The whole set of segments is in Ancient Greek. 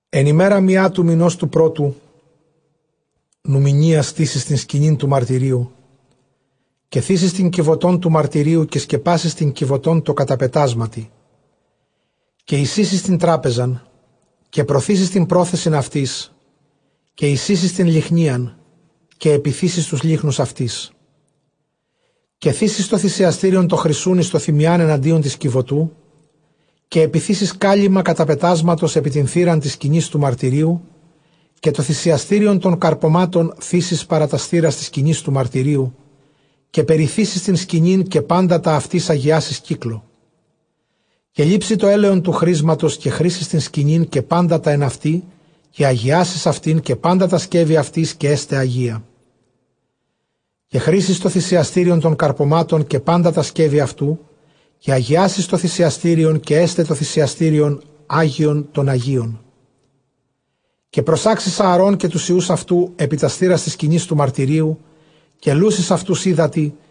ἐν ἡμέρᾳ μιᾷ τοῦ μηνὸς τοῦ πρώτου νουμηνίᾳ, στήσεις τὴν σκηνὴν τοῦ μαρτυρίου. Καὶ θήσεις τὴν κιβωτὸν τοῦ μαρτυρίου, καὶ σκεπάσεις τὴν κιβωτὸν τῷ καταπετάσματι. Καὶ εἰσοίσεις τὴν τράπεζαν, καὶ προθήσεις τὴν πρόθεσιν αὐτῆς· καὶ εἰσοίσεις τὴν λυχνίαν, καὶ ἐπιθήσεις τοὺς λύχνους αὐτῆς. Καὶ θήσεις τὸ θυσιαστήριον τὸ χρυσοῦν, εἰς τὸ θυμιᾷν ἐναντίον τῆς κιβωτοῦ· καὶ ἐπιθήσεις κάλυμμα καταπετάσματος ἐπὶ τὴν θύραν τῆς σκηνῆς τοῦ μαρτυρίου. Καὶ τὸ θυσιαστήριον τῶν καρπωμάτων θήσεις παρὰ τὰς θύρας τῆς σκηνῆς τοῦ μαρτυρίου· καὶ περιθήσεις τὴν σκηνήν, καὶ πάντα τὰ αὐτῆς ἁγιάσεις κύκλῳ. Καὶ λήψῃ τὸ ἔλαιον τοῦ χρίσματος, καὶ χρίσεις τὴν σκηνὴν, καὶ πάντα τὰ ἐν αὐτῇ, καὶ ἁγιάσεις αὐτὴν, καὶ πάντα τὰ σκεύη αὐτῆς, καὶ ἔσται ἁγία. Καὶ χρίσεις τὸ θυσιαστήριον τῶν καρπωμάτων, καὶ πάντα τὰ σκεύη αὐτοῦ· καὶ ἁγιάσεις τὸ θυσιαστήριον, καὶ ἔσται τὸ θυσιαστήριον ἅγιον τῶν ἁγίων. Καὶ προσάξεις Ἀαρὼν καὶ τοὺς υἱοὺς αὐτοῦ ἐπὶ τὰς θύρας τῆς σκηνῆς τοῦ μαρτυρίου, καὶ λούσεις αὐτοὺς ὕδατι.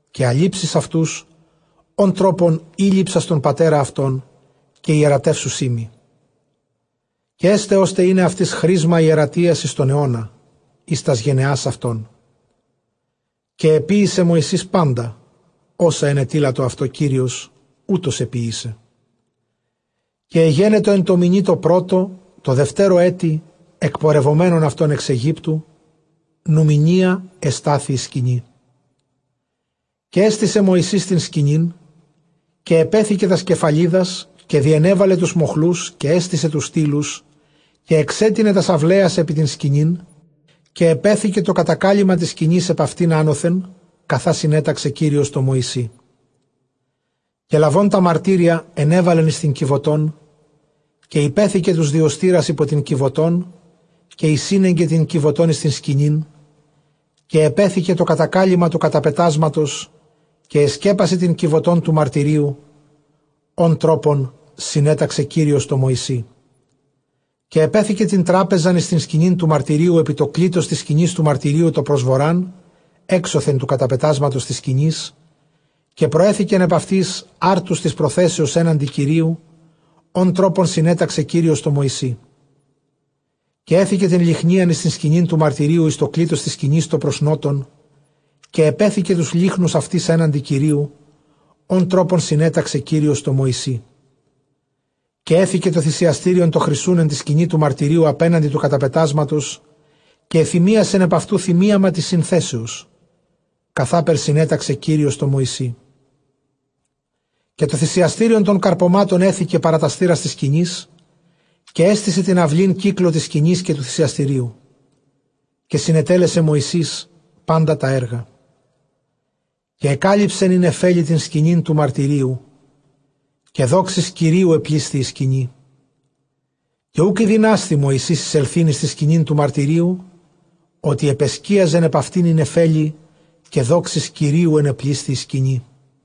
Καὶ ἀλείψεις αὐτοὺς ὃν τρόπον ἤλειψας τὸν πατέρα αὐτῶν, καὶ ἱερατεύσουσί μοι· καὶ ἔσται, ὥστε εἶναι αὐτοῖς χρίσμα ἱερατείας εἰς τὸν αἰῶνα, εἰς τὰς γενεὰς αὐτῶν. Καὶ ἐποίησε Μωυσῆς πάντα, ὅσα ἐνετείλατο αὐτῷ Κύριος, οὕτως ἐποίησε. Καὶ ἐγένετο ἐν τῷ μηνὶ τῷ πρώτῳ, τῷ δευτέρῳ ἔτει, ἐκπορευομένων αὐτῶν ἐξ Αἰγύπτου, νουμηνίᾳ ἐστάθη ἡ σκηνή. Καὶ ἔστησε Μωυσῆς τὴν σκηνὴν, καὶ ἐπέθηκε τὰς κεφαλιδας, καὶ διενέβαλε τοὺς μοχλοὺς, καὶ ἔστησε τοὺς στύλους. Καὶ ἐξέτεινε τὰς αὐλαίας ἐπὶ τὴν σκηνὴν, καὶ ἐπέθηκε τὸ κατακάλυμμα τῆς σκηνῆς ἐπʼ αὐτὴν ἄνωθεν, καθὰ συνέταξε Κύριος τῷ Μωυσῇ. Καὶ λαβὼν τὰ μαρτύρια ἐνέβαλεν εἰς τὴν κιβωτόν· καὶ ὑπέθηκε τοὺς διωστῆρας ὑπὸ τὴν κιβωτὸν, καὶ εἰσήνεγκε τὴν κιβωτὸν εἰς τὴν σκηνὴν, καὶ ἐπέθηκε τὸ κατακάλυμμα τοῦ καταπετάσματος, καὶ ἐσκέπασε τὴν κιβωτὸν τοῦ μαρτυρίου, ὃν τρόπον συνέταξε Κύριος τῷ Μωυσῇ· Καὶ ἐπέθηκε τὴν τράπεζαν εἰς τὴν σκηνὴν τοῦ μαρτυρίου, τὸ πρὸς Βοῤῥᾶν ἔξωθεν τοῦ καταπετάσματος τῆς σκηνῆς. Καὶ προσέθηκεν ἐπʼ αὐτῆς ἄρτους τῆς προθέσεως ἔναντι Κυρίου, ὃν τρόπον συνέταξε Κύριος τῷ Μωυσῇ. Καὶ ἔθηκε τὴν λυχνίαν εἰς τὴν σκηνὴν τοῦ μαρτυρίου, εἰς τὸ κλίτος τῆς σκηνῆς τὸ πρὸς Νότον. Καὶ ἐπέθηκε τοὺς λύχνους αὐτῆς ἔναντι Κυρίου, ὃν τρόπον συνέταξε Κύριος τῷ Μωυσῇ. Καὶ ἔθηκε τὸ θυσιαστήριον τὸ χρυσοῦν ἐν τῇ σκηνῇ τοῦ μαρτυρίου ἀπέναντι τοῦ καταπετάσματος, καὶ ἐθυμίασεν ἐνʼ αὐτοῦ θυμίαμα τῆς συνθέσεως, καθάπερ συνέταξε Κύριος τῷ Μωυσῇ. Καὶ τὸ θυσιαστήριον τῶν καρπωμάτων ἔθηκε παρὰ τὰς θύρας τῆς σκηνῆς. Καὶ ἔστησε τὴν αὐλὴν κύκλῳ τῆς σκηνῆς, και τοῦ θυσιαστηρίου· καὶ συνετέλεσε Μωυσῆς πάντα τὰ ἔργα. Καὶ ἐκάλυψεν ἡ νεφέλη τὴν σκηνὴν τοῦ μαρτυρίου· καὶ δόξης Κυρίου ἐπλήσθη ἡ σκηνή. Καὶ οὐκ ἠδυνάσθη Μωυσῆς εἰσελθεῖν εἰς τὴν σκηνὴν τοῦ μαρτυρίου, ὅτι ἐπεσκίαζεν ἐπʼ αὐτὴν ἡ νεφέλη, καὶ δόξης Κυρίου ἐνεπλήσθη ἡ σκηνή.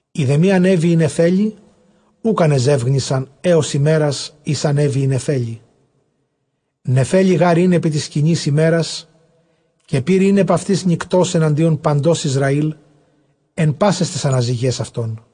Εἰ δὲ μὴ ἀνέβη ἡ νεφέλη, οὐκ ἀνεζεύγνυσαν ἕως ἡμέρας, ἧς ἀνέβη ἡ νεφέλη. Νεφέλη γὰρ ἦν ἐπὶ τῆς σκηνῆς ἡμέρας, καὶ πῦρ ἦν ἐπʼ αὐτῆς νυκτὸς ἐναντίον παντὸς Ἰσραὴλ, ἐν πάσαις ταῖς ἀναζυγαῖς αὐτῶν.